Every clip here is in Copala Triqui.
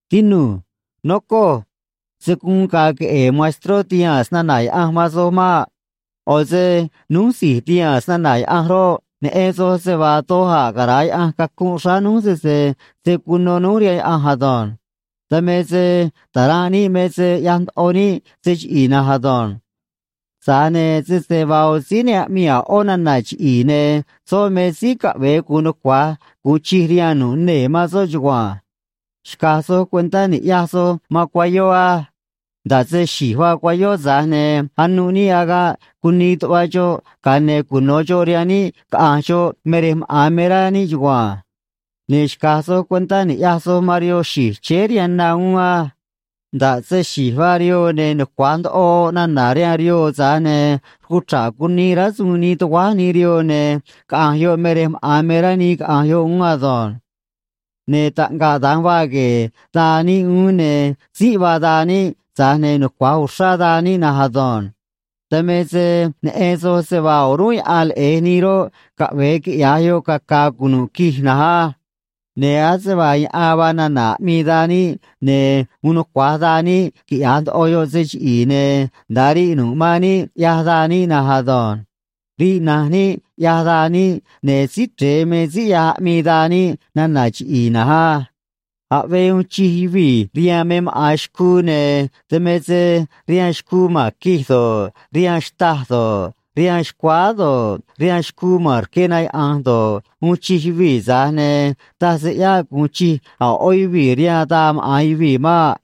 Tinu̱j. Nocoj. Se̱ guun ga̱a̱ queꞌe̱e̱ maestró tihaa̱n snana̱ Yaꞌanj man soj maꞌ. ꞌO̱ se núj si̱j tihaa̱n snana̱ Yaꞌanj roꞌ, neꞌen soj se vaa doj a̱ cara̱a Yaꞌanj cacunꞌ xráá núj sese se̱ cuno núj rihaan Yaꞌanj ado̱nj. Dan me se ta̱ranꞌ níꞌ me se ꞌyaj ndoꞌo níꞌ se chiꞌi̱i̱ na̱nj ado̱nj. Tza̱j ne̱ sese vaa ꞌo̱ síí ne aꞌmii a̱ ꞌó nana̱ chiꞌi̱i̱, ne̱ soꞌ me síí caꞌve̱e gu̱un nucua̱j gu̱un chij rihaan nu̱ꞌ nee̱ man soꞌ chugua̱nj. Xca̱j soj cuentá ni̱ꞌyaj soj man cuayó á. Nda̱ꞌ se xi̱j vaa cuayó, tza̱j ne̱ anuꞌ níꞌ agaꞌ cunii tuꞌva xoꞌ, ga̱a ne̱ cuno̱ xoꞌ rihaan níꞌ caꞌa̱nj xoꞌ me rej maꞌa̱n me rá níꞌ chugua̱nj. Ne̱ xca̱j soj cuentá ni̱ꞌyaj soj man rihoo xi̱j chéé rihaan na uún á. Nda̱ꞌ se xi̱j vaa rihoo, ne̱ nucua̱j ndoꞌo oꞌ nana̱ rihaan rihoo, tza̱j ne̱ rcuchra̱ꞌ cunii rásuun nii tuguáj nii rihoo, ne̱ caꞌa̱nj yoꞌ me rej maꞌa̱n me rá nii caꞌa̱nj yoꞌ uún ado̱nj. Ne̱ taꞌngaꞌ da̱nj vaa gue̱e̱ daa níꞌ uún, ne̱ tzínꞌ vaa daa níꞌ, tza̱j ne̱ nucua̱j uxrá daa níꞌ na̱nj ado̱nj. Dan me se neꞌen soj se vaa o̱rúnꞌ yaꞌan leꞌe̱j nii roꞌ, caꞌve̱e quiꞌya̱j yoꞌ caca̱a̱ cunu̱ꞌ quij na̱nj á. Ne̱ ase vaa yaꞌan vaa nana̱ aꞌmii daa níꞌ, ne̱ uun nucua̱j daa níꞌ quiꞌya̱j ndoꞌo yoꞌ se chiꞌi̱i̱, ne̱ nda̱a riꞌ nu̱ꞌ man níꞌ, ꞌyaj daa níꞌ na̱nj ado̱nj. Riꞌ na̱nj níꞌ, ꞌyaj daa níꞌ, ne̱ Síí Chre̱e me síí ꞌyaj aꞌmii daa níꞌ nana̱ chiꞌi̱i̱ na̱nj á. Aꞌvee uun chij yuvii̱ rihaan me maꞌa̱n xcuu, ne̱ dan me se rihaan xcuu ma̱n quij do̱ꞌ, rihaan xtâj do̱ꞌ, rihaan xcuáá do̱ꞌ, rihaan xcuu ma̱n rque na yaꞌa̱nj do̱ꞌ, uun chij yuvii̱, tza̱j ne̱ taj se ꞌyáꞌ gu̱un chij a̱ ꞌó yuvii̱ rihaan daa maꞌa̱n yuvii̱ maꞌ.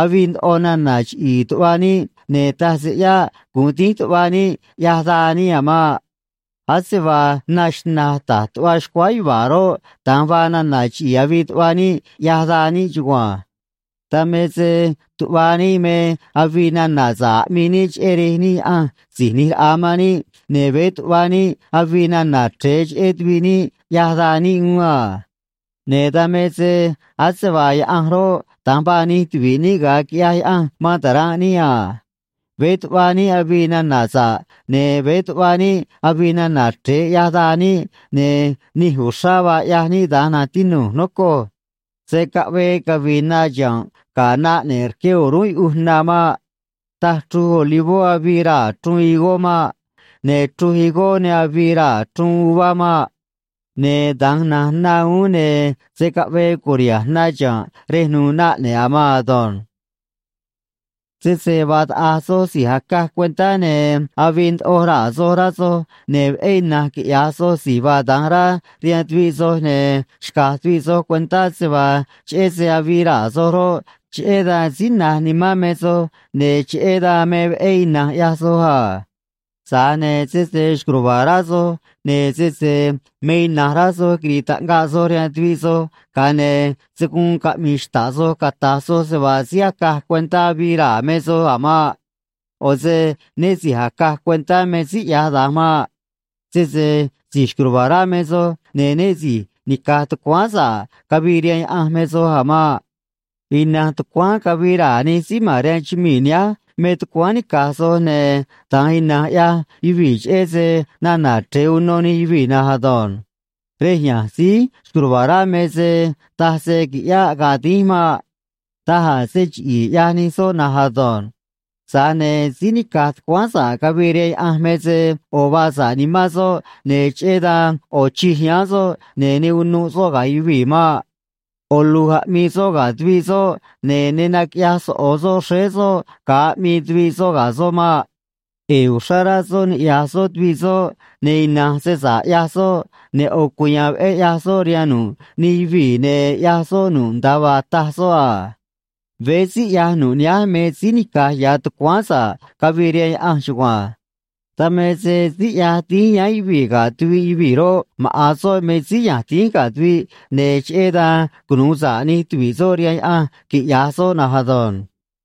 Avii ndoꞌo nana̱ chiꞌi̱i̱ tuꞌva níꞌ, ne̱ taj se ꞌyáꞌ gu̱un dínj tuꞌva níꞌ, ꞌyaj daa níꞌ a̱ maꞌ. Ase vaa na xna̱j ta̱j tuꞌva xcuáá yuva̱a̱ roꞌ, da̱nj vaa nana̱ chiꞌi̱i̱ avii tuꞌva níꞌ, ꞌyaj daa níꞌ chugua̱nj. Dan me se tuꞌva níꞌ me avii nana̱ sa̱ꞌ aꞌmii níꞌ cheꞌé Rej níꞌ Yaꞌanj Si̱j ꞌNi̱j Raꞌa man níꞌ, ne̱ veé tuꞌva níꞌ avii nana̱ chre̱e cheꞌé tuviꞌ níꞌ, ꞌyaj daa níꞌ uún a. Ne̱ dan me se ase vaa Yaꞌanj roꞌ, da̱nj vaa nij tuvi̱ꞌ níꞌ ga̱a quiꞌyaj Yaꞌanj man ta̱ranꞌ níꞌ a. Veé tuꞌva níꞌ avii nana̱ sa̱ꞌ ne̱ veé tuꞌva níꞌ avii nana̱ chre̱e, ꞌyaj daa níꞌ, ne̱ nij uxrá vaa ꞌyaj níꞌ da̱nj, na̱nj tinu̱j, nocoj. Se̱ caꞌvee cavi̱i̱ na chiha̱nꞌ ga̱ na ꞌne̱ꞌ rque o̱rúnꞌ yuꞌuj na maꞌ. Taj chruj olivó avii raa̱ chruun higó maꞌ. Ne̱ chruj higó ne avii raa̱ chruun uvá maꞌ. Ne̱ da̱nj na̱nj na uún, ne̱ se̱ caꞌvee cu̱riha̱nj na chiha̱nꞌ rej nu̱u̱ na ꞌne̱ꞌ a̱ maan ado̱nj. Sese vaa taꞌa̱j soj síí acaj cuentá ne̱ avii ndoꞌo raa̱ soj, rá soj, ne̱ veꞌé ina̱nj quiꞌya̱j soj si̱j vaa da̱nj rá rihaan tuviꞌ soj, ne̱ xca̱j tuviꞌ soj cuentá se vaa cheꞌé se avii raa̱ soj roꞌ, cheꞌé dan síí na̱j nimán me soj, ne̱ cheꞌé dan me veꞌé ina̱nj ꞌyaj soj a. Tza̱j ne̱ sese xco̱j ruva̱a̱ rá soj, ne̱ sese me ina̱nj rá soj quiri̱i̱ taꞌngaꞌ soj rihaan tuviꞌ soj, ga̱a ne̱ se̱ guun caꞌmi̱i̱ xta̱ꞌ soj cata̱j soj se vaa síí acaj cuentá avii raa̱ me soj a̱ maꞌ. ꞌO̱ se né si̱j acaj cuentá me síí ꞌyaj da̱nj maꞌ. Sese si̱j xco̱j ruva̱a̱ rá me soj, ne̱ né si̱j nica̱j tucuáán sa̱ꞌ cavii rihaan Yaꞌanj me soj a̱ maꞌ. Ina̱nj tucuáán cavii raa̱ nij síí ma̱n rihaan chumii̱ nihánj me tucuáán nica̱j soj, ne̱ da̱nj ina̱nj ꞌyaj yuvii̱ cheꞌé se nana̱ chre̱e uno nij yuvii̱ na̱nj ado̱nj. Rej ya̱nj síí xco̱j ruva̱a̱ rá me se taj se qui̱ꞌyáꞌ ga̱a̱ dínj maꞌ. Daj a̱ se chiꞌi̱i̱ ꞌyaj nij soꞌ na̱nj ado̱nj. Tza̱j ne̱ síí nica̱j tucuáán sa̱ꞌ cavii rihaan Yaꞌanj me se ꞌo̱ vaa sa̱ꞌ nimán soꞌ, ne̱ cheꞌé dan ꞌo̱ chij yáán soꞌ, ne̱ ne unuꞌ soꞌ ga̱ yuvii̱ maꞌ. ꞌO̱ lu̱j aꞌmii soꞌ ga̱ tuviꞌ soꞌ, ne̱ ne naquiꞌyaj soꞌo̱ soꞌ xréé soꞌ ga̱a aꞌmii tuviꞌ soꞌ ga̱ soꞌ maꞌ. ꞌE̱e̱ uxrá rá soꞌ niꞌya̱j soꞌ tuviꞌ soꞌ, ne̱ ina̱nj se sa̱ꞌ ꞌyaj soꞌ, ne̱ ꞌo̱ cuya̱a̱n veꞌé ꞌyaj soꞌ rihaan nu̱ꞌ nij yuvii̱, ne̱ ꞌyaj soꞌ nu̱ꞌ nda̱a vaa taj soꞌ a. Veé síí ꞌyaj nu̱ꞌ nihánj me síí nica̱j ya̱ tucuáán sa̱ꞌ cavii rihaan Yaꞌanj chugua̱nj. Dan me se síí ꞌyaj dínj yáán yuvii̱ ga̱ tuviꞌ yuvii̱ roꞌ, maꞌa̱n soꞌ me síí ya̱nj dínj ga̱ tuviꞌ, ne̱ cheꞌé dan cunu̱u sa̱ꞌ nij tuvi̱ꞌ soꞌ rihaan Yaꞌanj, quiꞌya̱j soꞌ na̱nj ado̱nj.